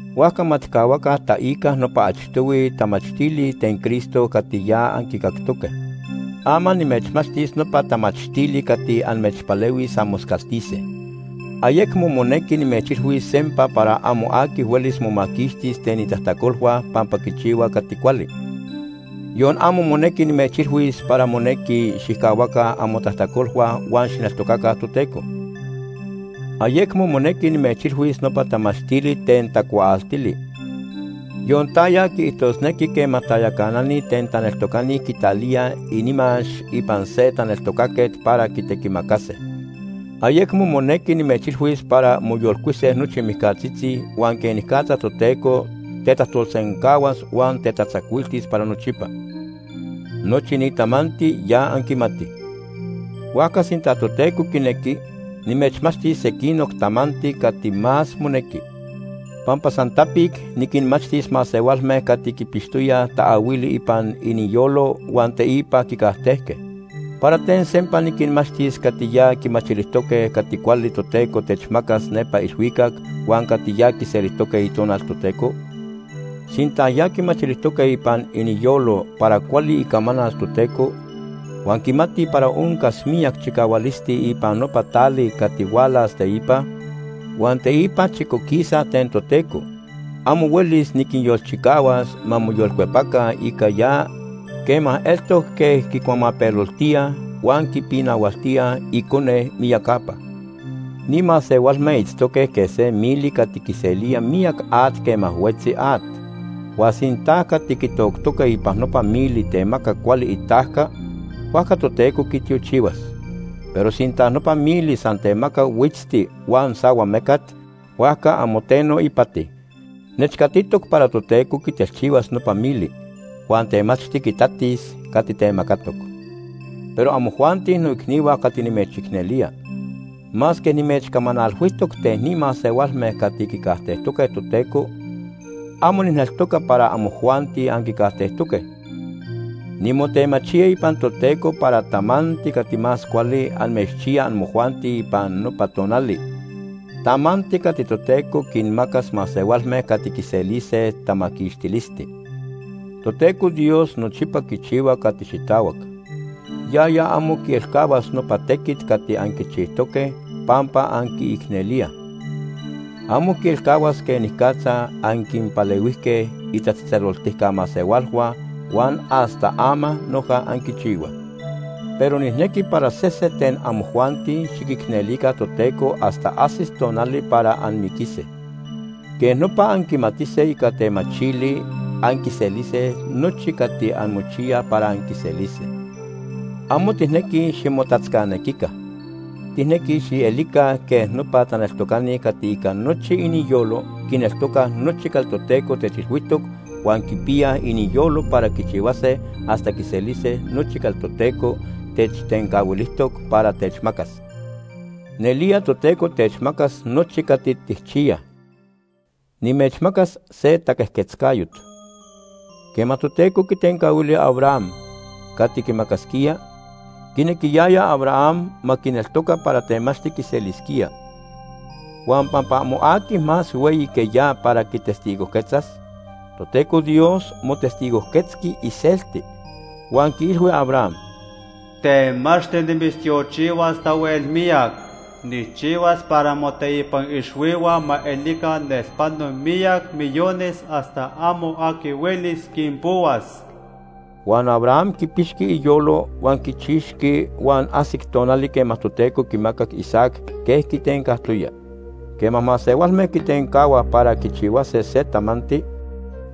Huajca ma tijcahuaca taica nopa achtohui tamachtili ten Cristo cati ya anquicactoque. Ama nimechmachtis nopa tamachtili cati amechpalehuis anmoscaltise. Ayecmo monequi nimechilhuis sempa para amo aqui huelis momaquixtis ten itajtacolhua pampa quichihua cati cuali, yon amo monequi nimechilhuis para monequi xijcahuaca amotajtacolhua huan xijneltocaca Toteco. Ayecmo monequi nimechilhuis nopa tamachtili ten tacuaaltili, yon taya quiijtosnequi quema tayacanani ten taneltocani quitalíaj inimax ipan se taneltocaquet para quitequimacase. Ayecmo monequi nimechilhuis para moyolcuise nochi mijcatzitzi huan quenicatza Toteco tetajtolsencahuas huan tetatzacuiltis para nochipa. Nochi ni tamanti ya anquimatij. Huajca sinta Toteco quinequi, nimechmachtis sequinoc tamanti cati más monequi. Pampa san tapic niquinmachtis masehualme cati quipixtoyaj taahuili ipan iniyolo huan teipa quicajtejque. ¿Para ten sempa niquinmachtis cati ya quimachilijtoque cati cuali Toteco techmacas nepa ilhuicac huan cati ya quiselijtoque Itonal Toteco? Sinta ya quimachilijtoque ipan iniyolo para cuali icamanal Toteco, huan quimatij para oncas miyac chicahualisti ipan nopa tali cati hualas teipa, huan teipa chicoquisaj ten Toteco, amo huelis niquinyolchicahuas ma moyolcuepaca ica ya quema eltoc quej quicuamapeloltíaj huan quipinahualtíaj Icone miyacapa. Ni masehualme itztoque quej se mili cati quiselía miyac at quema huetzi at. Huan sinta cati quitoctoque ipan nopa mili temaca cuali itajca, huajca Toteco quitiochihuas. Pero sinta nopa mili san temaca huitzti huan sahuamecat, huajca amo teno ipati. Nechcatitoc para Toteco quitelchihuas nopa mili. Huan temachti quitatis cati temacatoc. Pero amojuanti noicnihua cati nimechicnelía, masque nimechcamanalhuijtoc ten ni masehualme cati quicajtejtoque Toteco, amo nijneltoca para amojuanti anquicajtejtoque. Nimotemachía ipan Toteco para tamanti cati más cuali amechchiya amojuanti ipan nopa tonali, tamanti cati Toteco quinmacas masehualme cati quiselise tamaquixtilisti. Toteco Dios nochipa quichihua cati xitahuac. Yaya amo quielcahuas nopa tequit cati anquichijtoque pampa anquiicnelíaj. Amo quielcahuas quenicatza anquinpalehuijque itatzejtzeloltica masehualhua huan hasta ama noja anquichihuaj. Pero nijnequi para sese ten amojuanti xiquicnelica Toteco hasta ajsis tonali para anmiquise. Quej nopa anquimatise ica temachili anquiselise nochi cati anmochiyaj para anquiselise. Amo tijnequij ximotatzcanequica. Tijnequij xielica quej nopa taneltocani cati ica nochi iniyolo quineltocaj nochi cati Toteco techilhuijtoc huan quipiyaj iniyolo para quichiyase hasta quiselise nochi cati Toteco techtencahuilijtoc para techmacas. Nelía Toteco techmacas nochi cati tijchiyaj Nimechmacas se taquejquetzcayot. Quema Toteco quitencahuili Abraham cati quimacasquía, quinequiyaya Abraham ma quineltoca para temachti quiselisquía. Huan pampa amo aqui más hueyi que ya para quitestigojquetzas, Toteco Dios motestigojquetzqui iselti, huan quiilhui Abraham: “Temachti nimitztiochihuas tahuel miyac. Nijchihuas para moteipan ixhuihua ma elica nelpano miyac millones hasta amo aqui huelis quinpohuas.” Huan Abraham quipixqui iyolo huan quichixqui huan ajsic tonali quema Toteco quimacac Isaac quej quitencajtoya. Quema masehualme quitencahuaj para quichihuase se tamanti,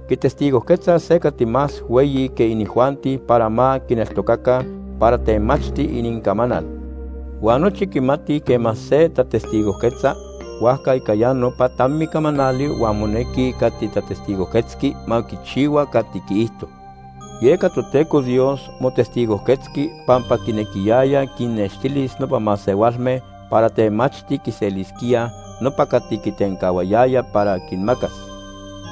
quitestigojquetzaj se cati más hueyi que inijuanti para ma quinneltocaca para temachti inincamanal. Huan nochi quimatij quema se tatestigojquetza huajca ica ya nopa tami camanali huan monequi cati tatestigojquetzqui ma quichihua cati quiijto. Yeca Toteco Dios motestigojquetzqui pampa quinequiyaya quinnextilis nopa masehualme para temachti quiselisquíaj nopa cati quitencahuayaya para quinmacas,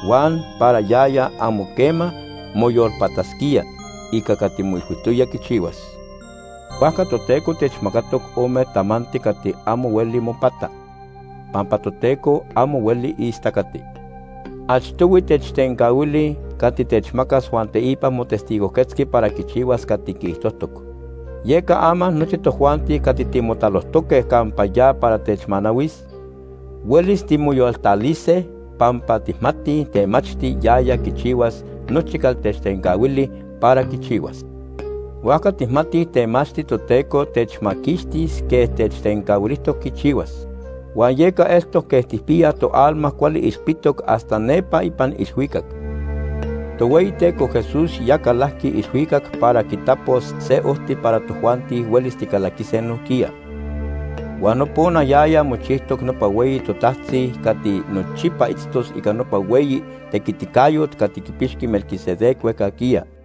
huan para yaya amo quema moyolpatasquía ica cati moilhuijtoya quichihuas. Huajca Toteco techmacatoc ome tamanti cati amo hueli mopata, pampa Toteco amo hueli istacati. Achtohui techtencahuili cati techmacas huan teipa motestigojquetzqui para quichihuas cati quiijtojtoc. Yeca ama nochi tojuanti cati timotalojtoque campa ya para techmanahuis, huelis timoyoltalise pampa tijmatij temachti yaya quichihuas nochi cati techtencahuili para quichihuas. Huajca tijmatij temachti Toteco techmaquixtis quej techtencahuilijtoc quichihuas. Huan yeca eltoc quej tijpiyaj toalma cuali ilpitoc hasta nepa ipan ilhuicac. Tohueyiteco Jesús ya calajqui ilhuicac para quitapos se ojti para tojuanti huelis ticalaquise nojquiya. Huan nopona yaya mochijtoc nopa hueyi totajtzi cati nochipa itztos ica nopa hueyi tequiticayot cati quipixqui Melquisedec huejcajquiya.